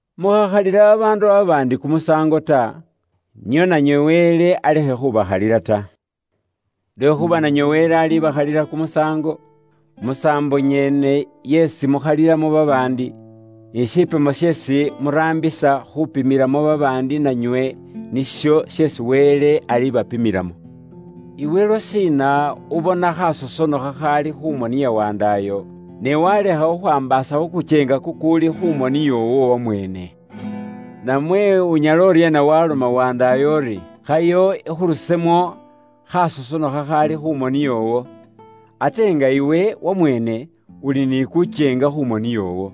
“Mukhakhalila babaandu babaandi kumusaango ta, nio nanywe Wele alekhe khubakhalila ta. Lwekhuuba nanywe Wele alibakhalila kumusaango, musaambo nyene yeesi mukhalilamo babaandi. Ni shipimo sheesi muraambisa khuupimilamo babaandi nanywe nisho sheesi Wele alibapimilamo. “Iwe lwashiina ubona khaasosono khakhaali khu moni ya wandaayo, ne waalekha khwaambaasa khu kukyeenga kukuuli khu moni yoowo wamweene? Namwe unyala uryeena waaloma wandaayo uri, ‘Khayo ikhurusemo khaasosono khakhaali khu moni yoowo,’ ate nga iwe wamweene uli ni kukyeenga khu moni yoowo?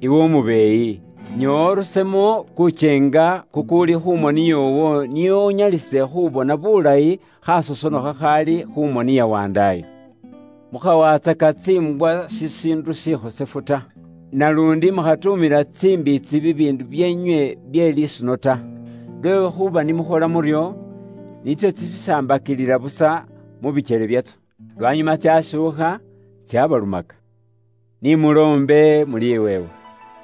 Iwe umubeeyi, nyoowa urusemo kukyeenga kukuuli khu moni yoowo nio unyalise khuubona bulayi khaasosono khakhaali khu moni ya wandaayo. “Mukhawatsaka tsiimbwa shishiindu shikhosefu ta, naluundi mukhatuumila tsimbiitsi bibiindu byeenywe bye lisuno ta. Lwekhuuba ni mukhola muryo, nitso tsibisambakilila busa mu bikyele byatso, lwanyuma tsaashuukha tsaabalumaka. “Ni muloombe muliweebwa,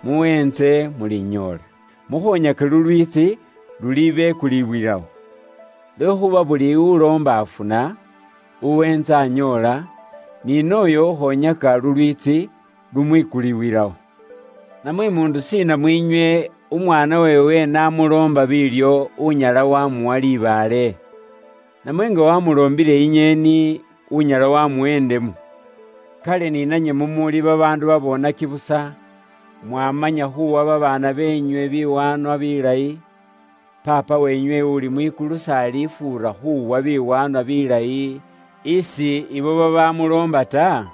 muweentse mulinyoola, mukhoonyake lulwiitsi lulibekuliwilawo. Lwekhuuba buli uloomba afuna, uweentsa anyoola, ni nooyo ukhoonyaka lulwiitsi lumukulibwilawo. “Namwe muundu shiina mwiinywe, umwaana weewe n'amuloomba biilyo unyala waamuwa libaale? Namwe nga waamuloombile inyeeni, unyala waamuwa indemu? Kale ni nanywe mumuuli babaandu baboonaki busa, mwaamanya khuuwa babaana beenywe biwaanwa bilayi, Paapa weenywe uuli mwikulu s'alifuura khuuwa biwaanwa bilayi isi ibo babaamuloomba ta?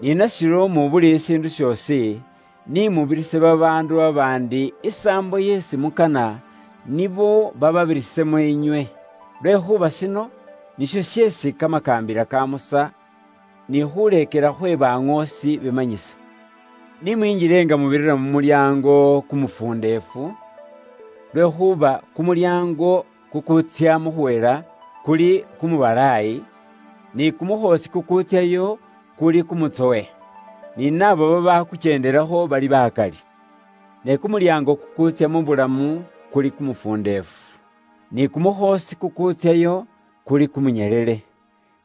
Ni nashiryo mu buli shiindu shoosi, ni mubirise babaandu babaandi isaambo isi mukana nibo bababirisemo inywe. Lwekhuuba shino nisho sheesi kamakaambila ka Musa ni khuuleekela khwe baŋoosi bimanyisa. “Ni mwinjile nga mubirira mu mulyaango kumufundeefu. Lwekhuuba kumulyaango kukuutsya mu khuhela kuli kumubalaayi, ni kumukhoosi kukuutsyayo kuli kumutsowe, ni naabo babaakukyendelakho bali bakali. Ne kumulyaango kukuutsya mu bulamu kuli kumufundeefu, ni kumukhoosi kukuutsyayo kuli kumunyelele,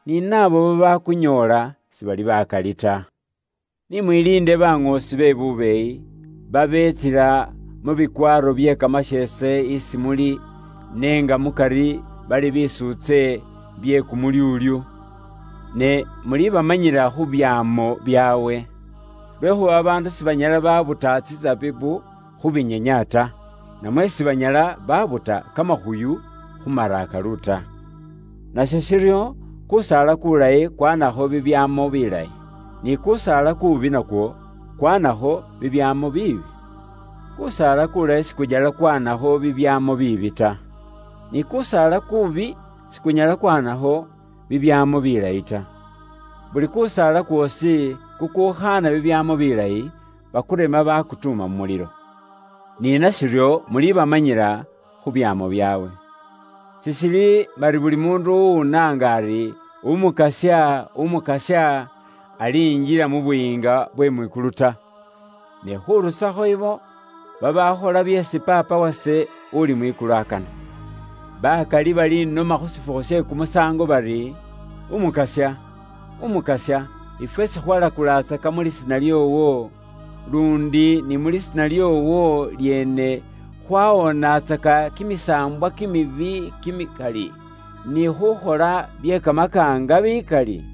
ni naabo babaakunyoola sibali bakali ta. “Ni mwiliinde baŋoosi be bubeeyi, babeetsila mu bikwaaro bye kamasheese isi muli ne nga mukari bali bitsuutse bye kumulyuulyu. Ne mulibamanyila khu byaamo byaabwe. Lwekhuuba babaandu sibanyala baabuta tsisabibu khu mawa ta, namwe sibanyala baabuta kimifiki khu mawa ta. Nasho shiryo, kuusaala kuulayi kwaanisakho bibyaamo bilayi, ni kuusaala kuubi nakwo kwaanakho bibyaamo biibi. Kuusaala kuulayi sikunyala kwaanakho bibyaamo biibi ta, ni kuusaala kuubi sikunyala kwaanakho bibyaamo bilayi ta. Buli kusaala kwoosi kukuukhaana bibyaamo bilayi, bakurema baakutuuma mu mulilo. Ni nashiryo, mulibamanyila khu byaamo byaabwe. “Sishili bari buli muundu uwunaanga ise ari, ‘Umukasya, Umukasya,’ alinjila mu Buyiinga bwe mwikulu ta; khurusakho ibo babaakhola byeesi Paapa wase uli mwikulu akana. Bakali baliinomela ise khu shifukhu she khuukhalikho kimisaango bari, ‘Umukasya, Umukasya, ifwe sikhwakholaatsaka buŋoosi mu lisiina lyoowo, luundi ni mu lisiina lyoowo lyeene khwawoonatsaka kimisaambwa kimibi kimikali, ni khukhola bye kamakaanga bikali?’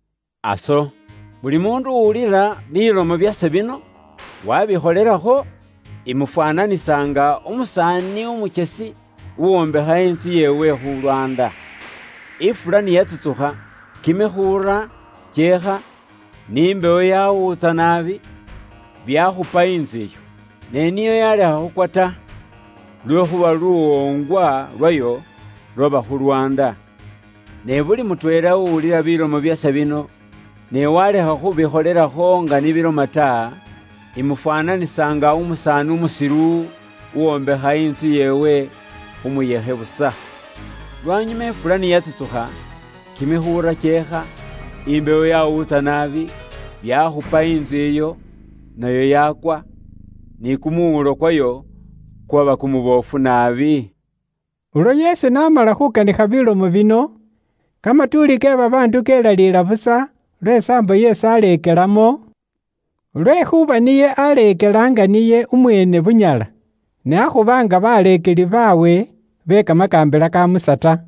“Aso, buli muundu uwulila bilomo byase bino, waabikholelakho, imufwaananisa nga umusaani umukyesi uwombekha intsu yeewe khu lwaanda. Ifula ni yatsutsukha, kimikhulula kyeekha, ni mbewo yawuutsa naabi, byakhupa intsu iyo. Ne niyo yaalekha khukwa ta, lwekhuuba luwoongwa lwayo lwaba khu lwaanda. Ne buli mutweela uwulila bilomo byase bino, ne waalekha khubikholelakho nga ni biloma ta, imufwaananisa nga umusaani umusilu uwombekha intsu yeewe khu muyekhe busa. Lwanyuma ifula ni yatsutsukha, kimikhulula kyeekha, imbewo yaawuutsa naabi, byaakhupa intsu iyo, nayo yaakwa, ni kumuwuulo kwayo kwaba kumuboofu naabi.” Ulwo Yesu n'amala khuukanikha bilomo bino, kamatuuli ke babaandu kelaliila busa lwe saambo isi aaleekelamo, lwekhuuba niye aaleekela nga niye umweene bunyala, ne akhuba nga baleekeli baabwe be kamakaambila ka Musa ta.